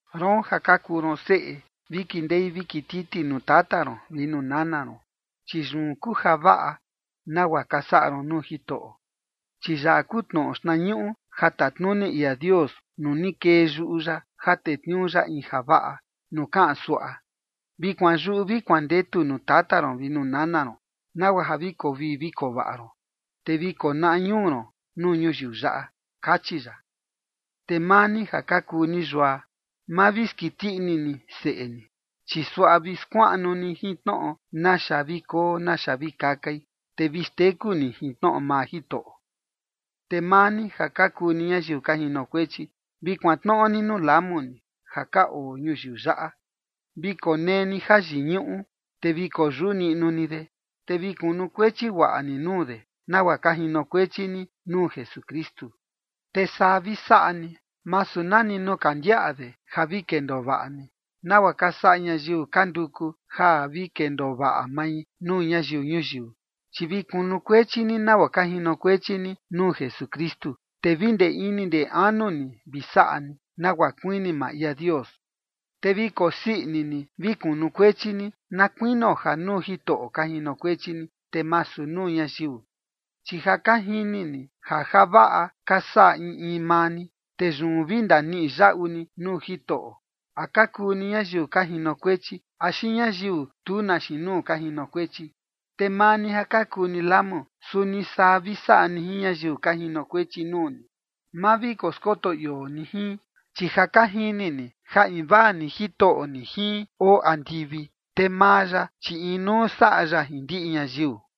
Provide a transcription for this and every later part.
Roon ja ka kuu ron seꞌe, vi kindei vi kititi nuu tata ron vi nuu nana ron, chi yun kuu javaꞌa, nagua ka saꞌa ron nuu Jitoꞌo. Chi yaꞌa kuu tnoꞌo xtnañuꞌu ja tatnuni ia Dios nuu ni kee yuꞌu ya ja tetniuu ya in javaꞌa, nuu kaꞌan suaꞌa: “Vi kuanyuꞌu vi kuandetu nuu tata ron vi nuu nana ron, nagua ja vi koo vii vi koo vaꞌa ron, te vi konaꞌa ñuu ron nuu ñuyiu yaꞌa”, kachi ya. Te maa ni ja ka kuu ni yua, ma vi skiti ini ni seꞌe ni, chi suaꞌa vi skuaꞌnu ni jin tnoꞌo naxa vi koo naxa vi kakai, te vi xteku ni jin tnoꞌo maa Jitoꞌo. Te maa ni ja ka kuu ni ñayiu ka jinokuechi, vi kuantnoꞌo ni nuu lamu ni ja ka oo ñuyiu yaꞌa. Vi konee ni jayiñuꞌu, te vi koyuꞌu niꞌnu ni de, te vi kunukuechi guaꞌa ni nuu de, nagua ka jinokuechi ni nuu Jesukristu. Te saa vi saꞌa ni, masu nani nuu ka ndiaꞌa de ja vi kendoo vaꞌa ni, nagua ka saꞌa ñayiu ka nduku ja vi kendoo vaꞌa mai nuu ñayiu ñuyiu, chi vi kunukuechi ni nagua ka jinokuechi ni nuu Jesukristu, te vi ndee ini ndee anu ni vi saꞌa ni, nagua kuini maa ia Dios. Te vi kosii ini ni vi kunukuechi ni, na kuinio ja nuu Jitoꞌo ka jinokuechi ni, te masu nuu ñayiu. Chi ja ka jini ni ja javaꞌa ka saꞌa in in maa ni, te yun vi ndaniꞌi yaꞌu ni nuu Jitoꞌo, a ka kuu ni ñayiu ka jinokuechi axi ñayiu tu na xiin nuu ka jinokuechi. Te maa ni ja ka kuu ni lamu, suni saa vi saꞌa ni jin ñayiu ka jinokuechi nuu ni. Ma vi koskoto ioo ni jin, chi ja ka jini ni ja invaa ni Jitoꞌo ni jin oo andivi, te maa ya, chi inuu saꞌa ya jin ndiꞌi ñayiu.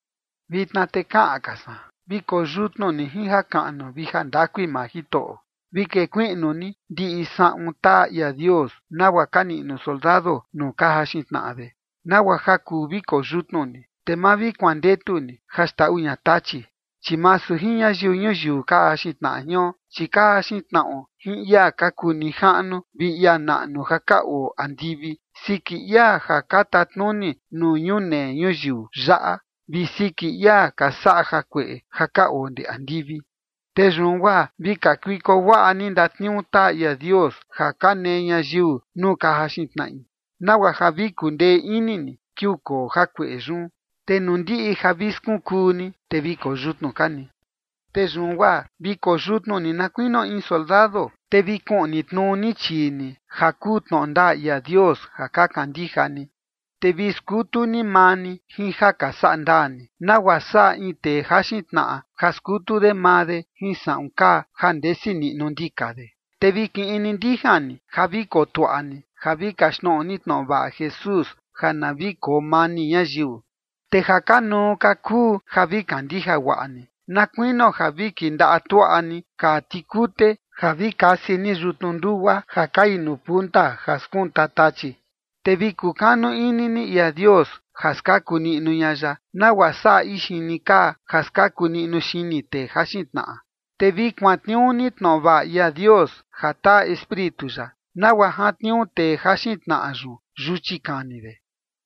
Vitna te kaꞌan ka san: Vi koyutnu ni jin jakaꞌnu vi jandakui maa Jitoꞌo. Vi kekuiꞌnu ni ndiꞌi saꞌun taa ia Dios nagua ka niꞌnu soldado nuu ka jaxin tnaꞌa de, nagua ja kuu vi koyutnu ni, te ma vi kuandetu ni ja xndaꞌu ña Tachi. Chi masu jin ñayiu ñuyiu ka jaxin tnaꞌa jion, chi ka jaxin tnaꞌo jin ia ka kuu nijaꞌnu vi ia naꞌnu ja ka oo andivi, siki ia ja ka tatnuni nuu ñunee ñuyiu yaꞌa, vi siki ia ka saꞌa jakueꞌe ja ka oo ndee andivi. Te yun guaa vi kakuiko guaꞌa ni ndatniuu taa ia Dios ja ka nee ñayiu nuu ka jaxin tnaꞌi, nagua ja vi kundee ini ni kiuu koo jakueꞌe yun, te nuu ndiꞌi ja vi skunkuu ni, te vi koyutnu ka ni. Te yun guaa vi koyutnu ni na kuinio in soldado, te vi kuꞌni tnuu ni chii ni ja kuu tnoꞌo ndaa ia Dios ja ka kandija ni. Te vi skutu ni maa ni jin ja ka saꞌa ndaa ni, nagua saꞌa in tee jaxin tnaꞌa, ja skutu de maa de jin saꞌun kaa ja ndesi niꞌnu ndika de. Te vi kiꞌi ni ndijan ni ja vi kotuaꞌa ni ja vi kaxtnoꞌo ni tnoꞌo vaꞌa Jesús ja na vi koo mani ñayiu. Te ja kanuu ka kuu ja vi kandija guaꞌa ni, na kuinio ja vi kindaꞌa tuaꞌa ni kaa tikute ja vi kasi ni yutnu ndugua ja kai nuu punta ja skunta Tachi. Te vi kukanu ini ni ia Dios ja skaku niꞌnu ña ya, nagua saꞌa ixini kaa ja skaku niꞌnu xini tee jaxin tnaꞌa. Te vi kuantniuu ni tnoꞌo vaꞌa ia Dios ja taa Espíritu ya, nagua jantniuu tee jaxin tnaꞌa yun yuchi kani de.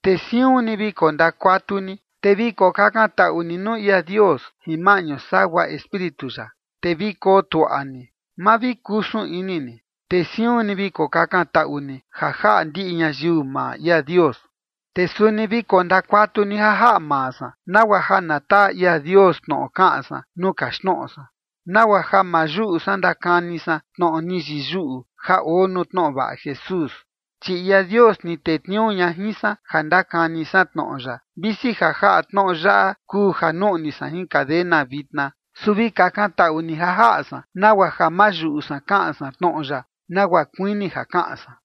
Te siun ni vi kondakuatu ni, te vi kokakantaꞌu ni nuu ia Dios jin maꞌñu sagua Espíritu ya, te vi koo tuaꞌa ni, ma vi kusun ini ni, te siun ni vi kokakantaꞌu ni ja jaꞌa ndiꞌi ñayiu maa ia Dios. Te suni vi kondakuatu ni ja jaꞌa maa san, nagua ja na taa ia Dios tnoꞌo kaꞌan san nuu kaxtnoꞌo san, nagua ja ma yuꞌu san ndakani san tnoꞌo ni yiyuꞌu ja oo nuu tnoꞌo vaꞌa Jesús. Chi ia Dios ni tetniuu ña jin san ja ndakani san tnoꞌo ya, visi ja jaꞌa tnoꞌo yaꞌa kuu ja nuꞌni san jin cadena vitna. Su vi kakantaꞌu ni ja jaꞌa san, nagua ja ma yuꞌu san kaꞌan san tnoꞌo ya nagua kuini ja kaꞌan san.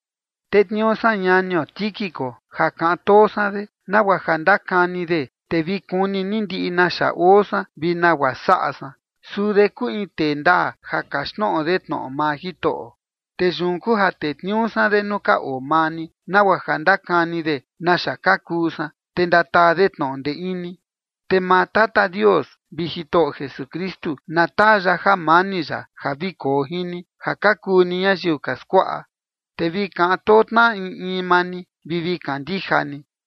Tetniuu san ñanio Tíquico ja kaꞌan too san de, nagua ja ndakani de, te vi kuni ni ndiꞌi naxa oo san vi nagua saꞌa san. Suu de kuu in tee ndaa ja kaxtnoꞌo de tnoꞌo maa Jitoꞌo. Te yun kuu ja tetniuu san de nuu ka oo maa ni, nagua ja ndakani de naxa ka kuu san, te ndataa de tnoꞌo ndee ini. Te maa Tata Dios vi Jitoꞌo Jesukristu na taa ya jamani ya ja vi koo jin ni ja ka kuu ni ñayiu ka skuaꞌa, te vi kaꞌan too tnaꞌa in in maa ni vi vi kandija ni.